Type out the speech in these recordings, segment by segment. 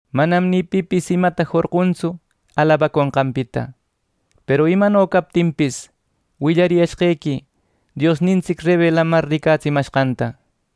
Manam ni pipis imata jorquntsu alabaconqanpita. Peru imano captinpis, willariyashqequi Diosnintsic rebelamar ricatsimashqanta.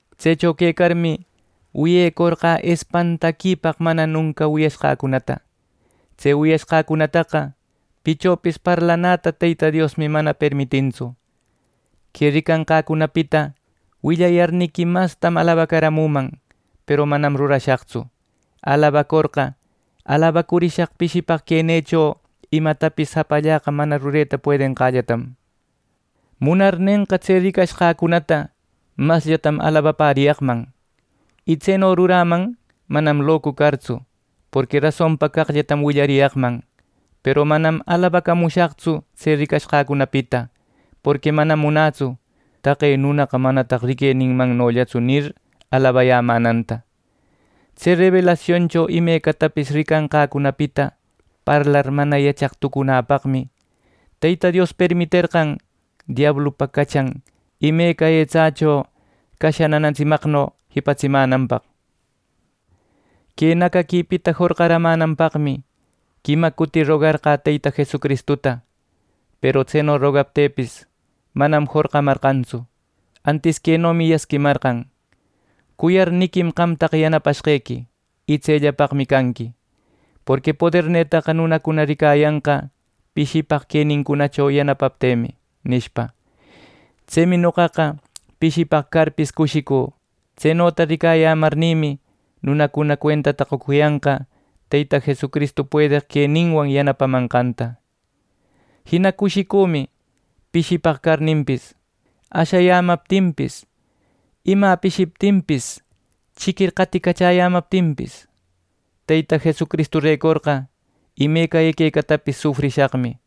Tsecho quecarmi, wiyecorqä espantaquipaq mana nunca wiyashqäcunata. Tse wiyanqäcunataqa pichopis parlacunäta Teyta Diosmi mana permitintsu. Que ricanqäcunapita willayarniqui mastam alabacaramüman; peru manam rurashaqtsu, alabacorqa alabacurishaq pishipaq quenïcho imatapis japallaqa mana rureta puedenqällatam. Munarnenqa, tse ricashqäcunata masllam alabapäriyaqman y tseno ruräman manam locu cartsu, porqui rasonpa caqllatam willariyaqman. Peru manam alabacamushaqtsu tse ricashqäcunapita. Porqui manam munätsu: “Taqe nunaqa manataq riqueninmannollatsu” nir, alabayämänanta. Tse rebelasioncho imecatapis ricanqäcunapita parlar mana yachaq tucunäpaqmi, Teyta Dios permiterqan diablupa cachan imeca etsächo casha nanatsimaqno jipatsimänanpaq. Que nacaquipita jorqaramänanpaqmi quima cuti rogacorqä Teyta Jesucristuta. Peru tseno rogacuptïpis, manam jorqamarqantsu; antis quenomi yasquimarqan: “Cuyarniquim qamtaqa yanapashqequi, y tsellapaqmi canqui; porqui podernïtaqa nunacuna ricayanqa pishipaq queniquicho yanapapteqmi” nishpa. Tsemi noqaqa pishipaq carpis cushicü. Tsenota ricayämarnïmi nunacuna cuentata qocuyanqa Teyta Jesucristu puedeq queninwan yanapamanqanta. Jina cushicümi pishipaq carninpis, ashayämaptinpis, imä pishiptinpis, chiquir qaticachäyämaptinpis. Teyta Jesucristurecorqa imeca equecatapis sufrishaqmi.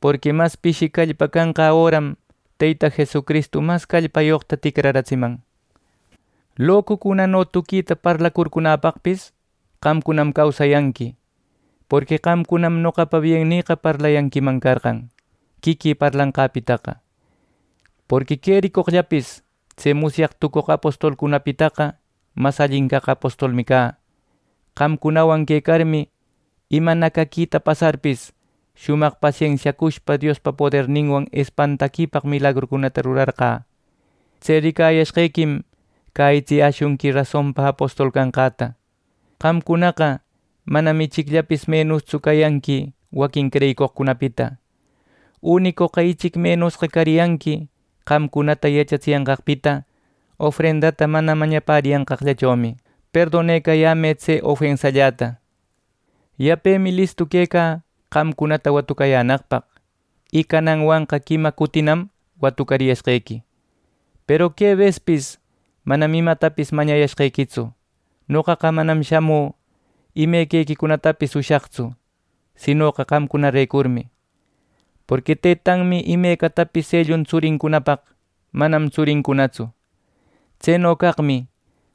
Porqui mas pishi callpa canqä öram, Teyta Jesucristu mas callpayoqta ticraratsiman. Locucunano tuquita parlacurcunäpaqpis qamcunam causayanqui; porqui qamcunam noqapa biennïqa parlayanquiman carqan, quiquï parlanqäpitaqa. Porqui quericoqllapis tse musyaq tucoq apostolcunapitaqa mas allin caq apostolmi cä Qamcunawan quecarmi, ima nacaquita pasarpis, shumaq pasensiacushpa Diospa poderninwan espantaquipaq milagrucunata rurarqä. Tse ricayashqequim cäyitsiyäshunqui rasonpa apostol canqäta. Qamcunaqa manam ichicllapis menustsu cayanqui waquin creyicoqcunapita. ¡Unicoqa ichic menusqa cariyanqui qamcunata yachatsiyanqaqpita ofrendata mana mañapäriyanqaqllachomi! ¡Perdonecayämë tse ofensalläta! Yapemi listu quecä qamcunata watucayänaqpaq, y cananwanqa quima cutinam watucariyashqequi, peru que bespis manam imatapis mañayashqequitsu. Noqa manam shamü imequicunapis ushaqtsu, sinoqa qamcunarecurmi. Porqui tëtanmi imecatapis ellun tsurincunapaq manam tsurincunatsu. Tseno caqmi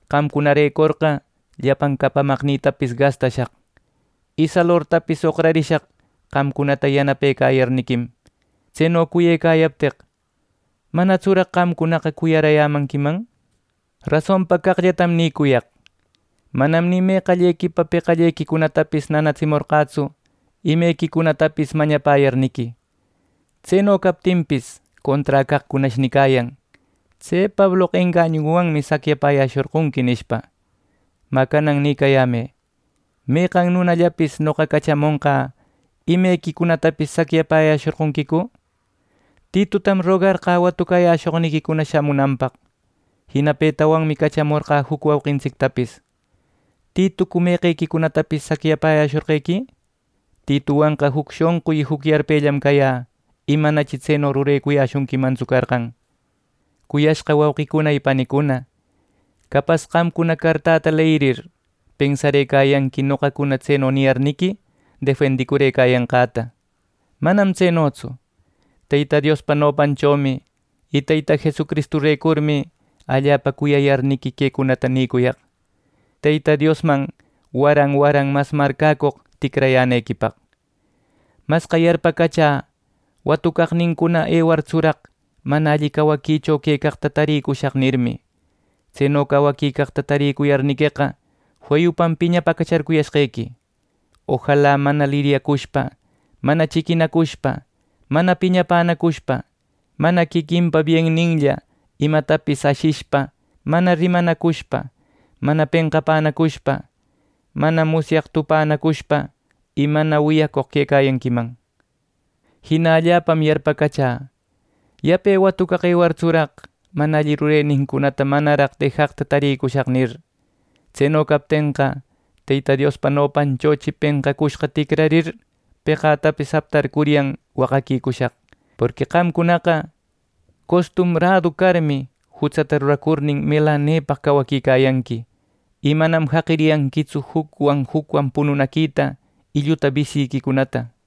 qamcunarecorqa llapan capamaqnïtapis gastashaq. Y salortapis oqrarishaq qamcunata yanapecayarniquim. Tseno cuyecayapteq, ¿manatsuraq qamcunaqa cuyarayämanquiman! Rasonpa caqllatam nïcuyaq: Manam ni meqallequipa peqallequicunatapis nanatsimorqätsu imequicunatapis mañapäyarniqui. Tseno captinpis, contra caqcunash nicayan “Tse Pabloqa engañunwanmi saquiapäyashorqonqui” nishpa. Mä canan nïcayämë: ¿Meqan nunallapis noqa cachamonqä imequicunatapis saquiayäshorqonquicu? Titutam rogarqä watucayäshoqniquicuna shamunanpaq. Jina petawanmi cachamorqä juc wauqintsictapis. ¿Titucu imequicunatapis saquiayäshorqequi? Tituwanqa juc shonqu y juc yarpellam cayä, y manachi tseno rurecuyäshunquimantsu carqan. Cuyashqa wauqicuna y panicuna, capas qamcuna cartäta leyirir, pensarëcayanqui noqacuna tseno niyarniqui defendicurëcayanqäta. ¡Manam tsenotsu! Teyta Diospa nopanchomi y Teyta Jesucristurecurmi allapa cuyayarniqui quecunata nïcuyaq, Teyta Diosman waran waran mas marcäcoq ticrayänequipaq. Masqa yarpacachä “Watucaqnincuna ewartsuraq mana alli cawaquicho quecaqta tarïcushaq” nirmi. Tseno cawaquicaqta taricuyarniqueqa feyupam piñapäcacharcuyashqequi. Ojala mana liryacushpa, mana chiquinacushpa, mana piñapänacushpa, mana quiquinpa bienninlla imatapis ashishpa, mana rimanacushpa, mana penqapänacushpa, mana musyaq tupänacushpa y mana wiyacoq quecayanquiman. Jina allapam yarpacachä “Yape watucaq ewartsuraq, mana alli rurenincunata manaraq dejaqta tarïcushaq” nir. Tseno captenqa, Teyta Diospa nopanchochi penqacushqa ticrarir, peqatapis aptarcuryan waqaquicushaq. Porqui qamcunaqa costumradu carmi, jutsata ruracurnin melanepaq cawaquicayanqui, y manam jaqiyanquitsu jucwan, jucwan pununaquita y lluta bisyiquicunata.